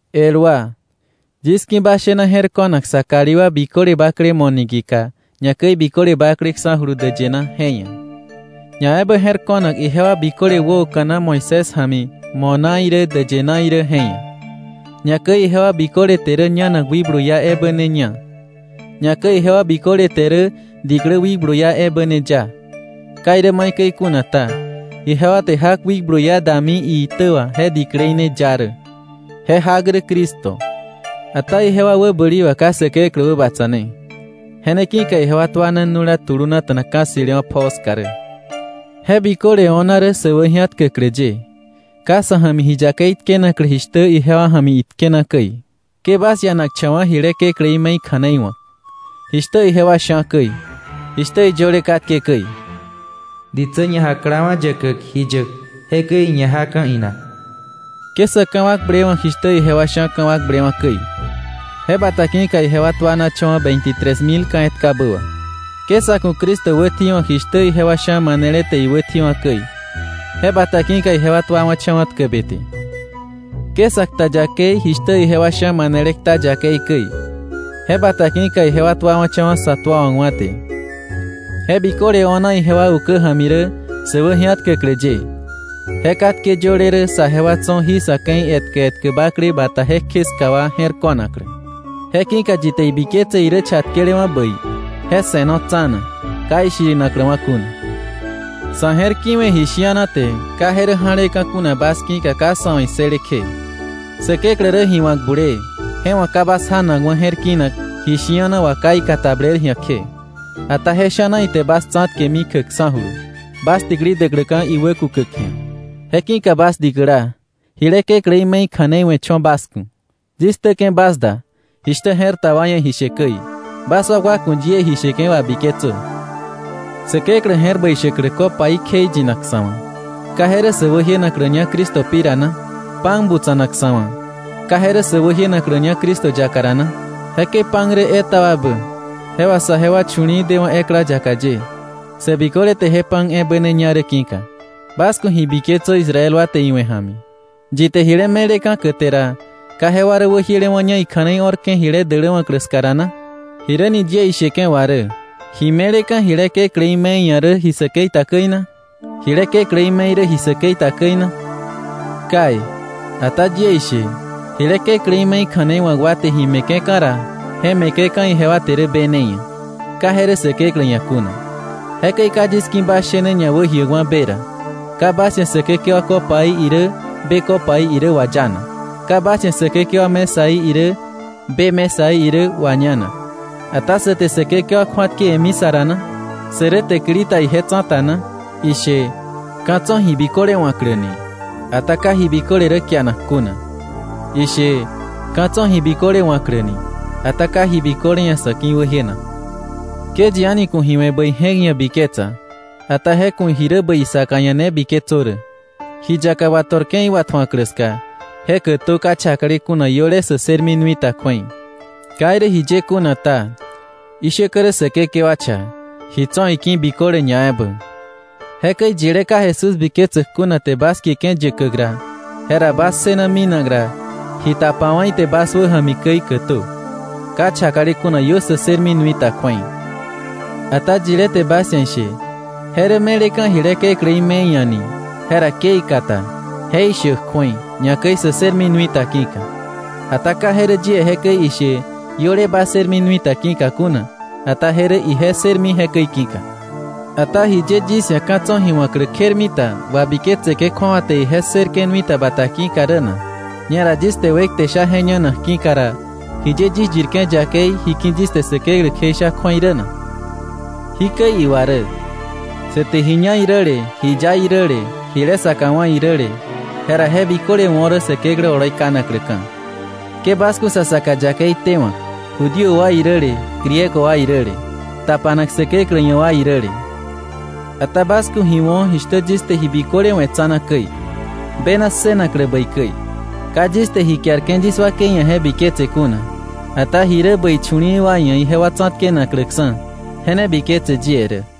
El wa, yis ki̱ bas shena je̱r ko̱nak sa kalí wa biköle bakle mo̱ niki̱ka, ñakäi biköle bakleksa̱julu däyë na je ia̱, ñaebä je̱r ko̱nak ijewa biköle wäoka̱na Moisés ja̱mi mo̱ na irä däyë na irä je ia̱, ñakäi ijewa biköle te rä ñanak wikblu iá ebä ne ña, ñakäi ijewa biköle te rä diklä wikblu iá ebä ne ya. Ka irä maikäi kuna ta, ijewa te jak wikblu iá dami iitä wà je diklei ne ya rä. Je jak rä Cristo. Ata ijewa wäbäli wà ka Säkeklä wäbatsa̱ne. Je ne ki̱ka ijewa tuana nu̱la tulunata̱na ka̱ ssi̱lewa̱ pjoo ska rä. Je biköle o̱na rä sä wäji̱atkäklä ye, ka sa̱ ja̱mi ji yakei tkenaklä jishtä ijewa ja̱mi itkena käi. Ke bas ianakcha̱wa̱ jile kekläí me̱i kja̱nei wa̱k, jishtä ijewa sha̱ käi, jishtä iyöle katke käi: “Ditsä ñajaklawa̱ yäkäk ji yäk, jekäi iñajaka̱ inak.” Ke sa̱ ka̱wakblewa̱k jishtä ijewa sha̱ ka̱wakblewa̱ käi. Je bata ki̱ka ijewa tuanacha̱wa̱ veintitres mil ka̱ etkabä wà. Ke sa̱ ku̱ Cristo wätji̱wa̱k jishtä ijewa sha̱ manele te iwätji̱wa̱ käi, je bata ki̱ka ijewa tuawa̱cha̱wa̱ tkäbe te. Ke sa kta yakei jishtä ijewa sha̱ manele kta yakei käi, je bata ki̱ka ijewa tuawa̱cha̱wa̱ sä tuawa̱kwa̱ te. Je biköle o̱na ijewa ukä ja̱mi rä sä wäji̱atkäklä ye, je katke yöle rä saje wa tso̱ jí sa̱ ke̱i etkä etkä bakle bata jekje ska wa je̱r ko̱naklä. Je ki̱ka yi te ibiketse irä chatkelewa̱ bäi, je se̱no tsa̱na, ka ishirinakläwa̱ kuna. Sa̱ je̱r kiwe̱ ji shi̱ana te ka je rä ja̱leka̱ kuna bas ki̱ka ka sa̱ wa̱ issële kje. Säkeklä rä ji wa̱k bulee, je wa̱ ka bas janakwa̱ je̱r kinak ji shi̱ana wà ka ikatabler ji̱a kje, ata je sha̱na ite bas tsa̱tkemi kjäkksa̱julu, bas täkili däkläka̱ iwäkukäk ji̱a. Je ki̱ka bas dikäla, jile kekläí me̱i kja̱nei we̱ cho̱ bas ku̱. Yis ktäke̱ bas da, jishtä je̱r ta wa ia̱ ji she käi. Bas wakwa ku̱ yie ji sheke̱ wabiketsö. Säkeklä je̱r bäi shäklä copaí kjeiyinak sa̱ wa̱, ¿ka je rä sä wäjienakläña Cristo pi ra na? Pan butsa̱nak sa̱ wa̱, ¿ka je rä sä wäjienakläña Cristo yaka ra na? Jekäi pan rä etaba ebä, je wà saje wa chu̱li̱i̱ dewa̱ ekla yaka ye, sä biköle te je pan ebä ne ña rä ki̱ka. Bas ku̱ ji biketsö Israel wa te iwe̱ ja̱mi. Yi te jile me̱leka̱ käte ra, ¿ka jewa rä wäjielewa̱ña ikja̱nei o̱rke̱ jile däläwa̱klä ska ra na? ¿Jiräni yie isheke̱ wà rä? ¿Ji me̱leka̱ jile kekläí me̱i ia̱ rä ji säkei ta käi na? ¿Jile kekläí me̱i rä ji säkei ta käi na? Kai, ata yie ishe, jile kekläí me̱i kja̱nei wa̱k wa te ji me̱ke̱ka̱ ra, je me̱ke̱ka̱ ijewa te rä be ne ia̱, ka je rä Säkeklä ia̱ kuna. Jekäi ka yis ki̱ bas shene ñawäjiäkwa̱ be ra. Ka bas ia̱ Säkekewa copaí irä be copaí irä wayanak. Ka bas ia̱ Säkekewa mesaí irä be mesaí irä wañanak. Ata ¿sä te Säkekewa kju̱atkewe̱mi sa ra na? ¿Sä rä täkili ta ije tsa̱ta na? Ishe: “Ka̱ tso̱ ji biköle wa̱klä.” Ata ka ji biköle rä kianak kuna. Ishe: “Ka̱ tso̱ ji biköle wa̱klä.” Ata ka ji biköle ia̱ sa̱ ki̱wäjienak. Ke yi a̱ni ku̱ ji we̱ bäi je̱k ia̱ biketsa, ata je ku̱ ji rä bäi isaka ia̱ ne biketsö rä. Ji yaka wato̱rke̱ iwatju̱aklä ska, je kätö ka chakale kuna iöle sä ssërmi nui ta kju̱ei. Ka irä jiye kuna ta, ishäkä rä Säkekewa cha, ji tso̱ iki̱ biköle ñaebä. Jekäi yilé ka Jesús biketsäk kuna te bas kieke̱ yäkäk ra, jera bas ssëna minak ra, ji tapawa̱ ite bas wäja̱mi käi kätö, ka chakale kuna iö sä ssërmi nui ta kju̱ei. Ata yilé te bas ia̱ ishe: “Je rä me̱leka̱ jile kekläí me̱i ia̱” ni, jera ke ikata, je ishäk kju̱ei, ñakäi sä ssërmi nui ta ki̱ka. Ata ka je rä yie jekäi ishe iöle ba ssërmi nui ta ki̱ka kuna, ata je rä ije ssërmi jekäi ki̱ka. Ata ¿jiye yis ia̱ ka̱ tso̱ ji wa̱klä kjermita wabiketseke̱ kju̱awa te ije ssërke̱ nui ta bata ki̱ka rä na? Ñera yis te wekte sha je ñanak ki̱ka ra, ¿jiye yis yirke̱ yakei ji ki̱ yis te Säkeklä kjeisha kju̱ei rä na? Jikäi iwa rä: Sä te ji ña iräle, ji ya iräle, jile saka wá̱ iräle, jera je biköle wo̱ rä Säkeklä oloi kanakläka̱. Ke bas ku̱ sa saka yakei tewa̱k Judío wa iräle Griego wa iräle, tapanak Säkeklä ia̱ wa iräle. Ata bas ku̱ ji wo̱ jishtä yis te ji biköle we̱ tsa̱na käi, bena ssënaklä bäi käi. Ka yis te ji kiarke̱ yis wakei ia̱ je biketse kuna, ata ji rä bäi chu̱li̱i̱ wa ia̱ ijewa tsa̱tkenakläksa̱, je ne biketse yie rä.